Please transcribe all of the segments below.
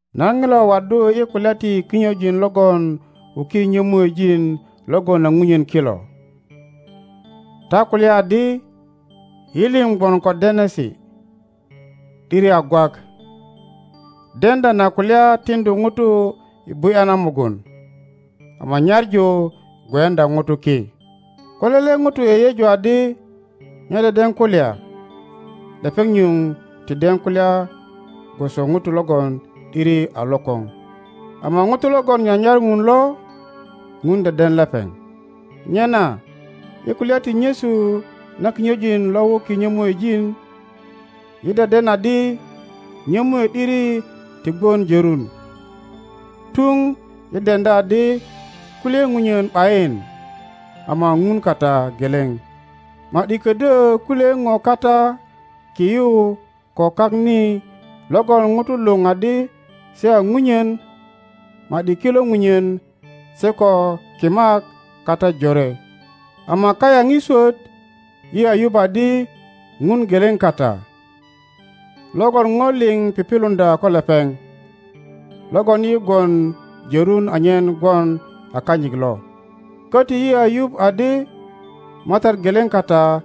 Nan ŋilo waddu i kulya ti kinyojin logon wuki nyomuejin logon a ŋunyen kilo. Ta kulya adi, Yi lio gwon ico denesi. ’Diri a gwak. Deŋdya na kulya tiŋdu ŋuto i bu ’ya na mugun, ama nyaŋu gweyuŋdya ŋuto ki. Ko lele ŋuto yeyeju adi nye deden kulya, lepeŋ nyuŋ ti den kulya gwoso ŋuto logon ’diri a lokoŋ. Ama ŋuto logon nyanyar ŋun lo, ŋun deden lepeŋ. Nyena i kulya ti nyesu na kinyojin lo wuki nyömuejin, yi deden adi nyomue ’diri ti gwon jorun, tuŋ yi deŋdya adi kulye ŋunyen ’bayin, ama ŋun kata geleŋ. Ma ’di ködyö kulye ŋo kata ki yu ko kak ni logon ŋutu luŋ adi se a ŋunyen, ma ’di kilo ŋunyen se ko kimak kata jore, ama kayaŋ i swot yi a yup adi Ŋun geleŋ kata, logon ŋo liŋ pipiluŋdya ko lepeŋ, logon yi gwon jörun anyen gwon a kanyit lo. Köti yi a yup adi Matat geleŋ kata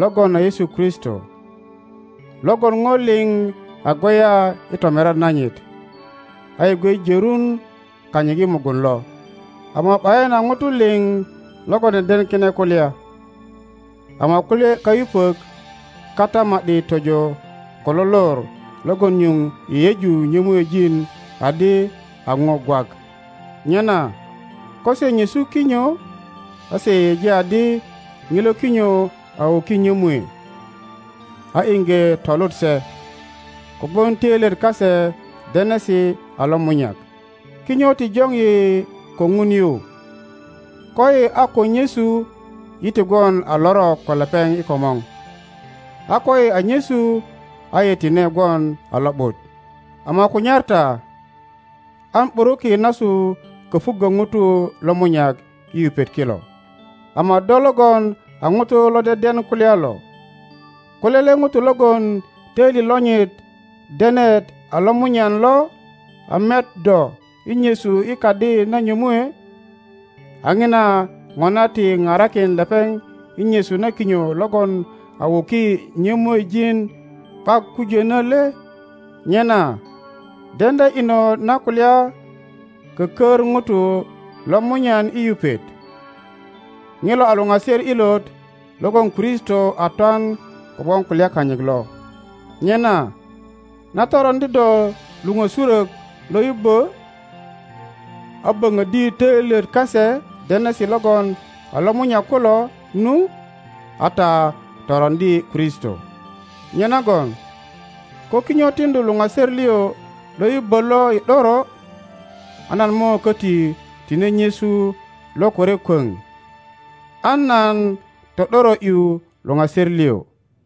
logon a Yesu Kristo, logon ŋo lio a gweya i tomirian nanyit, ayi gwe jorun kanyit i mugun lo. Ama ’bayin a ŋutu liŋ logon deden kine kulya, ama kulye kayupök kata ma ’di tojo ko lo lor logon nyuŋ yeyeju nyömuejin adi a ŋo gwak. Nyena ko se nyesu kinyo, a se yeyeji adi ŋilo kinyo a wuki nyömue, a iŋge tolut se, kogwon töilyet kase denesi a lomunyak. Kinyo ti joŋ yi ko Ŋun yu; koyi a ko nyesu yi ti gwon a lorok ko lepeŋ i komor, a koyi a nyesu a yi tine gwon a lo ’but. Ama kunyar ta an ’buruki nasu kopuŋgo ŋutu lomunyak i yupet kilo. Ama do logon a ŋuto lo deden kulya lo, ko lele ŋuto logon toili lonyit denet alomunyan lo a met do i nyesu i kadi na nyomue, a ŋina ŋona ti parakin lepeŋ i nyesu na kinyo logon a wuki nyomuejin ’bak kujönö le? Nyena deŋdya inot na kulya kökör ŋuto lomunyan i yupet, ŋilo a luŋaser ilot logon Kristo a twan kogwon kulya kanyit lo. Nyena na toroŋdi ta luŋösurök lo yubbö, a böŋöddi töilyet kase denesi logon a lomunyak kulo nu, a ta toroŋdi Kristo. Nyenagon ko kinyo tiŋdu luŋaser lio lo yubbö lo i ’doro, a nan mo köti tine nyesu lokore kwöŋ, an nan to ’doro ’yu luŋaser lio.